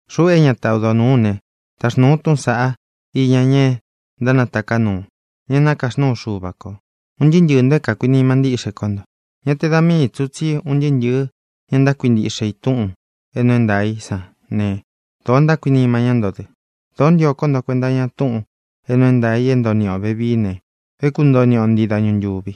Xuꞌu é ñata odo nūú u ne, taxnūu u túꞌūn saꞌá iña ña ntánataká nuu, ña é nakaxnúu Xuva kō, un ntɨɨ́ ntɨɨ̄ nto é kākuinima ntíꞌxe kó nto. Ñá te da mii tsī ú, tsí un ntɨɨ́ ntɨ̄ɨ́ ña ntákuintiꞌxe i túꞌūn é nuu é ntaā í san ne, dōo ntákuinima ñá nto dɨ. Dōó ntio kó nto kuenta iña túꞌūn é nuu é ntaā i é ntoo niꞌi ō vevií ne, é kuntoo niꞌi o ntii dañu ntūvi.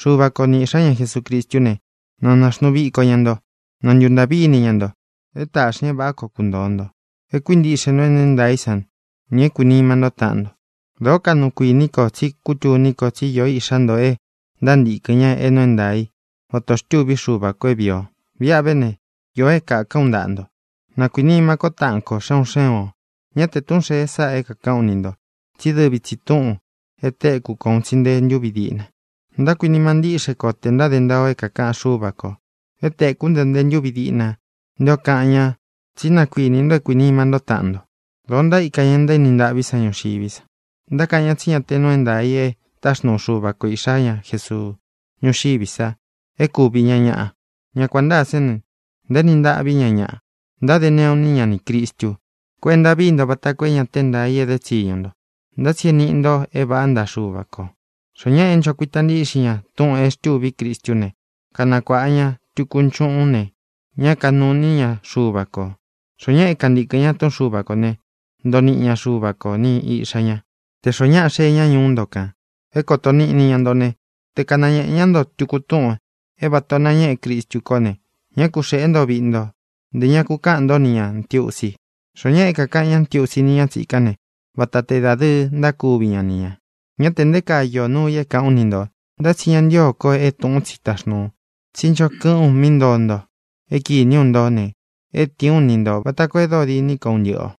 Xuva ko ni Iꞌxā ñá Jesucristú ne, na nāxnuu viko ña nto; na ntuntāꞌví ini ña nto, é tāꞌxi ña é vāꞌá koo kuntōo nto, é kuīntiꞌxe nto é nuu é ntaā í san, nī é kuīnima ntó taꞌan nto. Dōó kaꞌnu kuiní ko tsí kutuní ko tsí īó iꞌxá nto e ntántīkɨn ña é nuu é ntaā í, vata ō xtúvi Xuva kō é vīi o. Viꞌa ve ne, īo é kākán u ntaꞌa nto: na kuīnima kó taꞌan ko xé un xé un ō. Ñá te tūꞌun xée sáꞌā é kākaꞌán u ni ntō tsí dɨvi tsi tūꞌun e téku ko un tsi nte ntúvi díꞌna. Ntákuinima ntíꞌxe ko tē ntáde ntaa o é kākaꞌan Xúva kō. E téku nto nte ntúvi díꞌna nté ō kaꞌan ña tsí na kuīni nto é kuīnima ntó taꞌan nto. Dōo ntaíka ña ntaéni ntaꞌví san ñuxiví sa. Ntákaꞌan ña tsí ñá tē nuu é ntaā i e táxnuu Xuva ko Iꞌxā ñá Jesuu ñuxiví sa e kúvi ña ñaꞌa. Ña kuān ntáa sán ne, ntaéni ntaꞌví ña ñaꞌa. Ntáde neꞌu iní ña nī Cristu. Kuenta víi nto vata koo é ña te é ntaā i éde tsiñu ntō, ntá tsi é nīꞌi nto é vāꞌá ntaꞌa Xuva kō. Xoó ñaꞌa é ncho kuita ntíꞌxin ña túꞌūn e xtûví Cristú ne, kanakuāꞌa ña tuku nchuꞌun ne, ña kanúu ini ña Xuva kō. Xoó ñaꞌa é kantīkɨn ña túꞌun Xuva kō ne, ntoo niꞌi ña Xuva ko ni Iꞌxā ña. Tē xoó ñaꞌa xee ña ñuú nto kān é kōto níꞌni ña nto ne, te kanañēꞌe ñá nto tuku túꞌūn é vata ō nañéꞌe Cristu kó ne, ñá ku xēꞌé nto viꞌi nto, ntē ña ku kaꞌán nto ni ñā ntiusi. Xoó ñaꞌa é kākaꞌan ñá ntiusi ni ña tsikán ne, vata te dadɨɨ ntákuvi ña ni ñā. Ñá tē nté kaa īó nuu i é kāꞌán u ni ntō, ntá tsi ña ntío ko é tūꞌún tsi taxnūu u. Tsí ncho kɨꞌɨ́n u mí ntoo nto é kīní u nto ne, é tīin ú ni ntō, vata koo e dóo diní ko un ntɨꞌɨ ō.